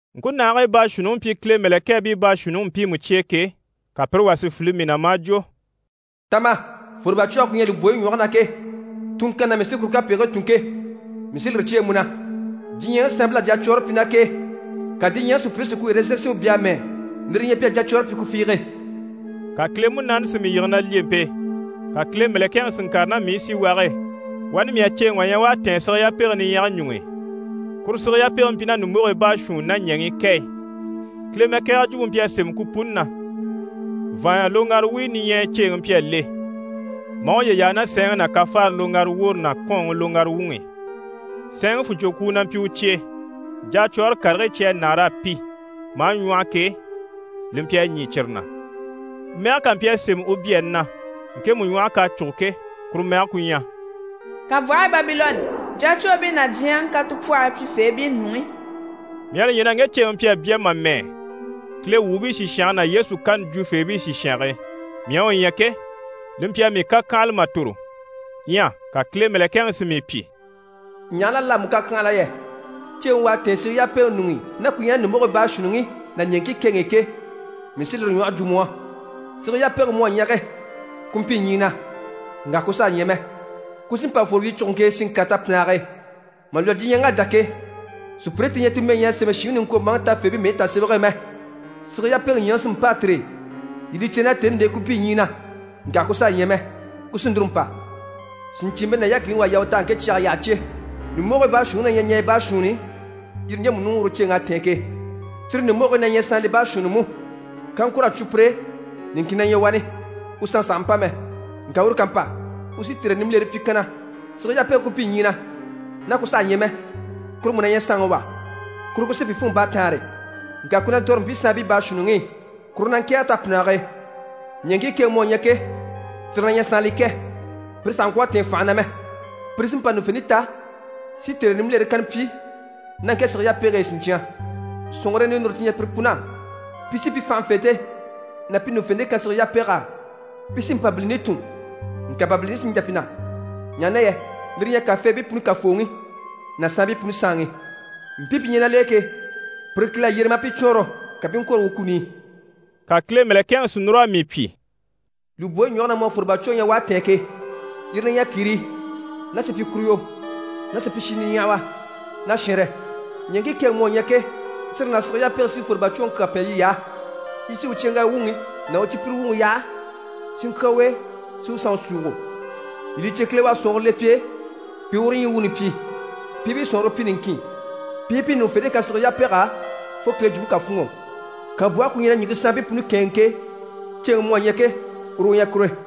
Ŋkunahigii baashuunniŋi mpyi Kile mɛ̀lɛkɛɛbii baashuunniŋi mpiimu cye e ke, ka pire wà si file mii na, maa jwo: «Ta ma, fwòrobacwɔge ku ɲyɛ lùbwoyi ɲwɔge na ke, tunŋkanni na mii sí kuru kapegigii tùn ke, mii sí lire cyêe mu na. Diɲyɛŋi saanbil'à jacwɔɔre pyi ná k'e, ka diɲyɛŋi sùpyire si ku ɛrɛzɛn sinmpe bya a mɛ́ɛ, lire li ɲyɛ pi à jacwɔɔre pyi ku fiige.» Ka Kile Munaani si mii yige na lyempe e, ka Kile mɛ̀lɛkɛŋi si ŋkàre ná mii i síwage e. Wani mii à ceeŋi wà ɲya u à tɛ̀ɛn sige yapege niɲyɛga ɲuŋ'i. Kuru sige yapege mpyi ná ɲùmbogii baashuunni ná ɲɛŋii kɛ e, Kile mɛkɛgɛrɛ jwumpe mpyi a sémɛ ku puni na. Vàanya loŋgara wuyo niɲyɛya ceeŋi mpyi a le, maa uye yaa ná sɛɛnŋi ná kafaare loŋgara woore ná kɔ́ɔnŋi loŋgara wuŋi i. Sɛɛnŋi fùnɲcwokwuu na mpyi u cye e, jacwɔɔre karigii cyi à nâar'a pi maa ɲwɔ́hɔ ke, li mpyi a ɲî cyire na. Mɛge kà mpyi a sémɛ u byaani na ŋkemu ɲwɔhe k'à cûgo ke, kuru mɛge ku ɲyɛ: «Kànbwɔhe Babilɔnni: jacwoobii ná diɲyɛŋi katupwɔhɔyi pyifeebii nuŋi.» Mii à li ɲya na ŋge ceeŋi mpyi a bya mà mɛ́ɛ Kile wuubii sìshange ná Yesu kani jwufeebii sìshange e. Mii à u ɲya ke, li mpyi a mii kàkyanhala mà tòro. Ɲyɛ ka Kile mɛ̀lɛkɛŋi si mii pyi: «Ɲaha na l'à mu kàkyanhala yɛ? Ceeŋi u à tɛ̀ɛn sige yapege ɲuŋ'i ná ku ɲyɛ ná ɲùmbogigii baashuunniŋi ná ɲɛɛŋkii kɛŋi i ke, mii sí lire ɲwɔhe jwo mu á. Sige yapege mu à ɲya ke, ku mpyi ɲyii na, ŋka ku saha ɲyɛ mɛ, ku sí n‑pa fworo wyicuguŋke e, si ŋkàre tapinnage e. Mà lwɔ́ diɲyɛŋ'à dá ke, sùpyire ti ɲyɛ ti mɛyi ɲyɛ a sémɛ shìŋi niŋkwombaaŋi tafeebii mɛyi tasemɛge e mɛ, sige yapege ɲyaŋi sí n‑pâa tire e. Yii li cè na tèni l'e ku mpyi ɲyii na, ŋka ku saha ɲyɛ mɛ, ku sí núru n‑pa. Sìɲcyiimpe ná yákiliŋi u à yaa u tɛ̀g'a ŋke cyage yyaha cè. Ɲùmbogigii baashuunniŋi na ɲyɛ ɲaɲya baashuunni yire ɲjemu ɲuŋ'i uru ceeŋ'à tɛ̀ɛn ke. Cyire ɲùmbogigii na ɲyɛ saanlii baashuunni mú, kaŋkur'à cwo pire e, niŋkin na ɲyɛ wani, u sanŋi sàha mpa mɛ. Ŋka uru ká mpa, u sí tère nimbilere pyi kanna. Sige yapege ku mpyi ɲyii na, ná ku saha ɲyɛ mɛ, kuru mú na ɲyɛ saanŋi wà, kuru ku sí pi fûnŋɔ baataanre, ŋka ku na ntɔ̀re mpii saanbii baashuunniŋi i. Kuru na ŋkɛ̀ɛge tapinnage e. Ɲɛɛŋkii kɛŋi mu à ɲya ke, cyire na ɲyɛ saanlii kɛ, pire sàha ŋkwɔ̀ a tɛ̀ɛn fànhe na mɛ. Pire sí n‑pa ɲùŋufente ta si tère nimbilere kanna pyi ná ŋke sige yapege e siɲcyan. Sɔ̀nŋɔre ninure ti ɲyɛ pire pun'á, pi sí pi fànhafente ná pi ɲùŋufente kan sige yapeg'á. Pi sí Mpabilini tùn, ŋka Mpabilini sí n‑jà pi na, ɲaha na yɛ lire li ɲyɛ kàfeebii puni Kafooŋi ná saanbii puni Saanŋi. Mpii pi ɲyɛ ná l'e ke, pire Kile à yyere maa pi cwɔɔnrɔ, ka pi i ŋkwôro u kuni i.» Ka Kile mɛ̀lɛkɛŋi si núr'a mii pyi: «Lùbwoyi ɲwɔge na mu à fwòrobacwoŋi ɲya u à tɛ̀ɛn ke, yire na ɲyɛ kìrii ná supyikuruyo ná supyishi niɲyahawa ná shɛnrɛ. Ɲɛɛŋkii kɛŋi mu à ɲya ke, cyire ná sige yapege sí fwòrobacwoŋi kyaa pɛn yiy'á. Yi sí u cyeŋgaya wuŋi ná u cipyire wuŋi yaha, si ŋkyà u e, si u sanŋi súugo. Yii li cè, Kile u à sɔ̀nŋɔre le pi e pi i uru ɲyii wuuni pyi, pi i pi sɔ̀nŋɔre pyi niŋkin, pi i pi ɲùŋufente kan sige yapeg'á, fo Kile jwumpe ká fûnŋɔ. Kànbwɔhe ku ɲyɛ na ɲìŋke saanbii puni kɛ̂ɛnŋi ke, ceeŋi mu à ɲya ke, uru u ɲyɛ kure.»